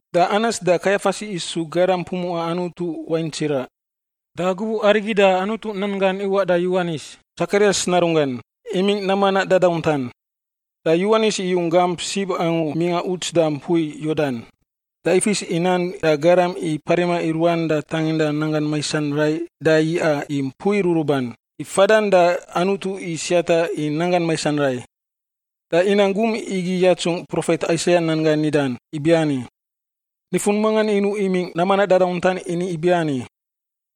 Da Anas da Kaiafas isu garam pumuꞌa Anutu wain tsiraꞌ. Da gubuꞌ arigi da Anutu nan gan iwaꞌ da Yowanis, Tsakarias narunggan, imingꞌ nam manaꞌ dadauntan. Da Yowanis iyung gamp sib angu mingꞌa uts da mpui Yordan, da ifis i nan da garam i parima i ruan da tanginda nanggan maisan rai da yiꞌa i mpui ruruban, i fadan da Anutu i siata i nanggan maisan rai. Da inang gum igi yatsungꞌ profet Aisaia nan gan nidan ibiani: “Nifun mangan inuꞌ imingꞌ nam manaꞌ dadauntan ini ibiani,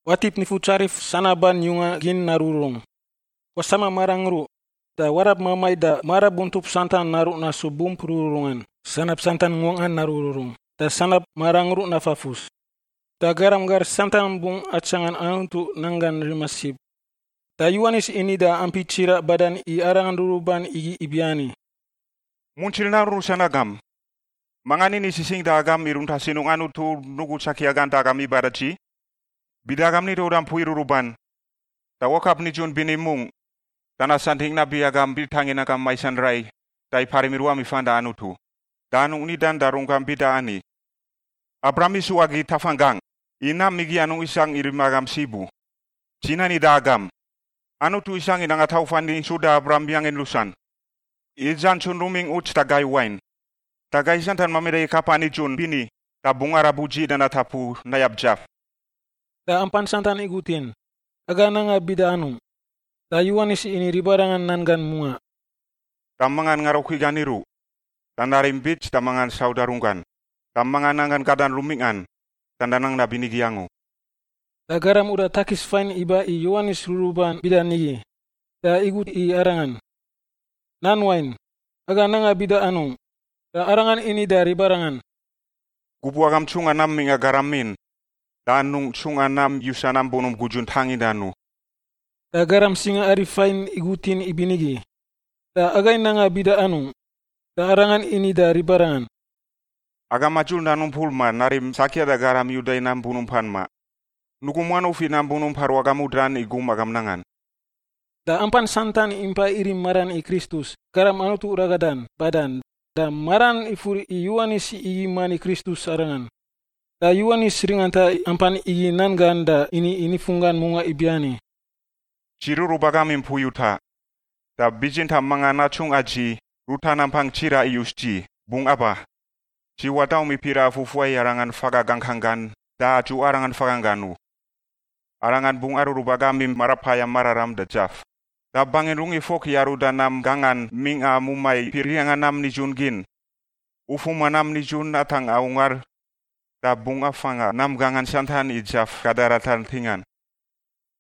‘Watip Nifutsarif sanaban yunga gin narururung. Wasama marangruꞌ, da warab mamai da marabuntup santan naruꞌ nasu bump rururungan. Sanab santan nguangꞌan narururung, da sanab marangruꞌ nafafus. Da garam gar santan bungꞌ atsangan Anutu nanggan rima sib.’” Da Yowanis ini da ampi tsiraꞌ badan i arangan ruruban igi ibiani, “Muntsir narun rusan agam! Mangan ini sisingꞌ da agam i runta sinungꞌ Anutu nugu tsakia gan da agam iba da dzi? Bida agam nida uda mpui ruruban, da wakap nidzun bini mungꞌ da nasantingꞌ nabi agam itangin nanggam maisan rai da iparim i ruam ifan da Anutu. Da anungꞌ nidan da runggam bida ani, ‘Abraham isu agi tafanggangꞌ,’ i nam igi anungꞌ isangꞌ i rima agam sib u. Dzi nani da agam, Anutu isangꞌ nanga tauf ani suda Abraham yangin rusan. I dzantsun rumingꞌ uts da gai wain, da gai santan mamida i kapa nidzun bini da bungꞌ arab udziꞌ da natapu nayab dzaf.” Da ampan santan igutin, “Aga nanga bida anungꞌ?” Da Yowanis ini ribarangan nan gan mungaꞌ, “Da mangan ngarukui gan iruꞌ da narim bits da mangan sauda runggan. Da mangan nanggan gadan rumingꞌan da nanang nabinigi angu.” Da garam uda takis fain iba i Yowanis ruruban bida nigi, da igut i arangan, “Nan Wain, aga nanga bida anungꞌ?” Da arangan ini da ribarangan, “Gubuꞌ agam ntsungꞌan nam mingꞌa garamin da anungꞌ ntsungꞌa nam yusa nam bunump gudzun tangindan u.” Da garam singaari fain igutin ibinigi, “Da agai nanga bida anungꞌ?” Da arangan ini da ribarangan, “Agam madzur nan umpur ma narim tsakia da garam i uda i gan nam bunumpan ma. Nugum wanuf i nam bunump aru agam udan i gum agam nangan.” Da ampan santan impa irim maran i Kristus, Garam Anutu Ragadan, badan, da maran ifur i Yowanis igi mani Kristus arangan. Da Yowanis ringanta i ampan igi nan gan da ini i nifunggan mungaꞌ ibiani, “Dzi rurub agam i mpui utaꞌ. Da bitsintaꞌ mangan atsungꞌa dzi, ruta nampang tsiraꞌ iyus dzi, bungꞌ aba. Dzi wadaum i piraꞌa fufuai i Arangan faga gangkang gan da adzuꞌa Arangan faganggan u. Arangan bungꞌ arurub agam i Marapayam Mararam da dzaf. Da bangin rugif fok i aruda nam gangan mingꞌa mumai piriangꞌa nam nidzun gin, ufuma nam nidzun atangꞌa ungar da bungꞌ afanga nam gangan santan i dzaf gada ratar ntingan.”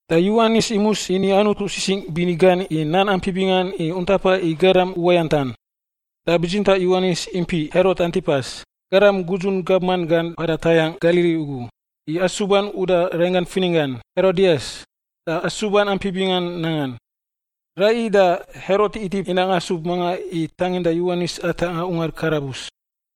Da Yowanis imus ini Anutu sisingꞌ bini gan i nan ampi bingan i untapa i garam uwayantan. Da bitsintaꞌ Yowanis impiꞌ Herot Antipas, garam gudzun gabman gan mpada tayangꞌ Galili ugu, i asuban uda rainggan fininggan, Herodias, da asuban ampi bingan nangan. Raiyi da Herot itip inang asub mangan i tanginda Yowanis atangꞌa ungar karabus.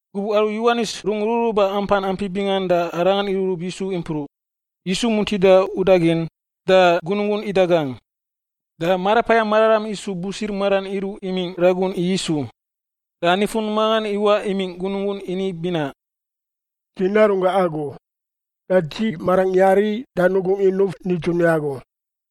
Gubuꞌ aru Yowanis rung ruruba ampan ampi bingan da arangan irurub Yisu impruꞌ. Yisu muntida udagin, da gunungun idagangꞌ. Da Marapayam Mararam isu busir maran iruꞌ imingꞌ ragun i Yisu. Da nifun mangan iwaꞌ imingꞌ gunungun ini binaꞌ, “Dzi narunggangꞌ agu, da dzi marangꞌ yari da nugungꞌ inuf nidzun i agu.”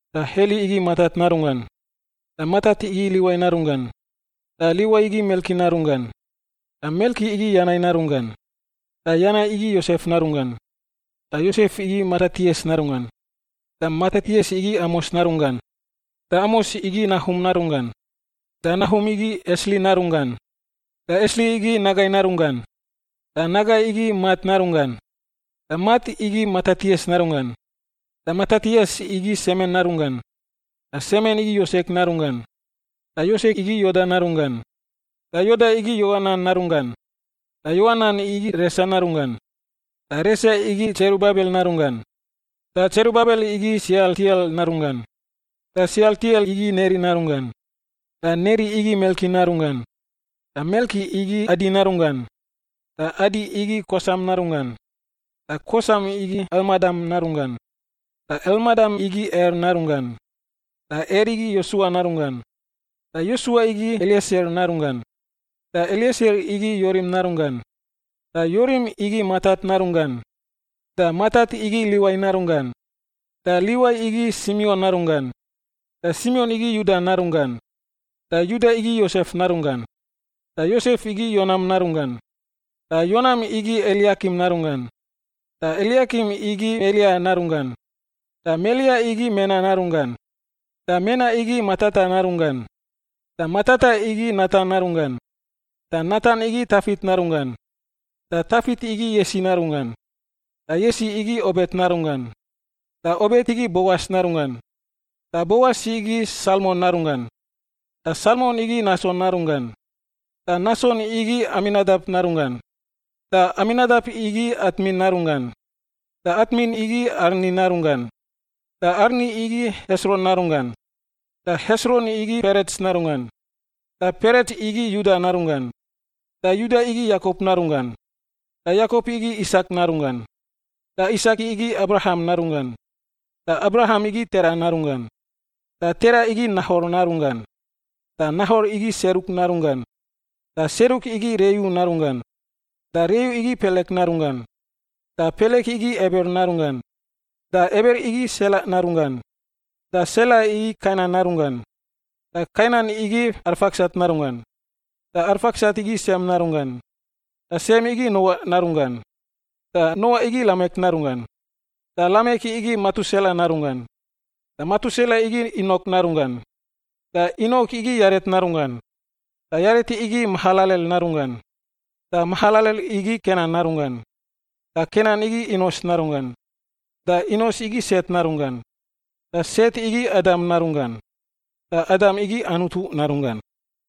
Da Heli igi Matat narunggan. Da Matat igi Liwai narunggan. Da Liwai igi Melki narunggan. Da Melki igi Yanai narunggan. Da Yanai igi Yosef narunggan. Da Yosef igi Matatias narunggan. Da Matatias igi Amos narunggan. Da Amos igi Nahum narunggan. Da Nahum igi Esli narunggan. Da Esli igi Nagai narunggan. Da Nagai igi Mat narunggan. Da Mat igi Matatias narunggan. Da Matatias igi Semen narunggan. Da Semen igi Yosek narunggan. Da Yosek igi Yoda narunggan. Da Yoda igi Yoanan narunggan. Da Yoanan igi Resa narunggan. Da Resa igi Tserubabel narunggan. Da Tserubabel igi Sealtiel narunggan. Da Sealtiel igi Neri narunggan. Da Neri igi Melki narunggan. Da Melki igi Adi narunggan. Da Adi igi Kosam narunggan. Da Kosam igi Elmadam narunggan. Da Elmadam igi Er narunggan. Da Er igi Yosua narunggan. Da Yosua igi Elieser narunggan. Da Elieser igi Yorim narunggan. Da Yorim igi Matat narunggan. Da Matat igi Liwai narunggan. Da Liwai igi Simion narunggan. Da Simion igi Yuda narunggan. Da Yuda igi Yosef narunggan. Da Yosef igi Yonam narunggan. Da Yonam igi Eliakim narunggan. Da Eliakim igi Melea narunggan. Da Melea igi Mena narunggan. Da Mena igi Matata narunggan. Da Matata igi Natan narunggan. Da Natan igi Tafit narunggan. Da Tafit igi Yesi narunggan. Da Yesi igi Obet narunggan. Da Obet igi Boas narunggan. Da Boas igi Salmon narunggan. Da Salmon igi Nason narunggan. Da Nason igi Aminadap narunggan. Da Aminadap igi Atmin narunggan. Da Atmin igi Arni narunggan. Da Arni igi Hesron narunggan. Da Hesron igi Perets narunggan. Da Perets igi Yuda narunggan. Da Yuda igi Yakop narunggan. Da Yakop igi Isak narunggan. Da Isak igi Abraham narunggan. Da Abraham igi Tera narunggan. Da Tera igi Nahor narunggan. Da Nahor igi Seruk narunggan. Da Seruk igi Reu narunggan. Da Reu igi Pelek narunggan. Da Pelek igi Eber narunggan. Da Eber igi Sela narunggan. Da Sela igi Kainan narunggan. Da Kainan igi Arfaksat narunggan. Da Arfaksat igi Sem narunggan. Da Sem igi Noa narunggan. Da Noa igi Lamek narunggan. Da Lamek igi Metusela narunggan. Da Metusela igi Inok narunggan. Da Inok igi Yaret narunggan. Da Yaret igi Mahalalel narunggan. Da Mahalalel igi Kenan narunggan. Da Kenan igi Inos narunggan. Da Inos igi Set narunggan. Da Set igi Adam narunggan. Da Adam igi Anutu narunggan.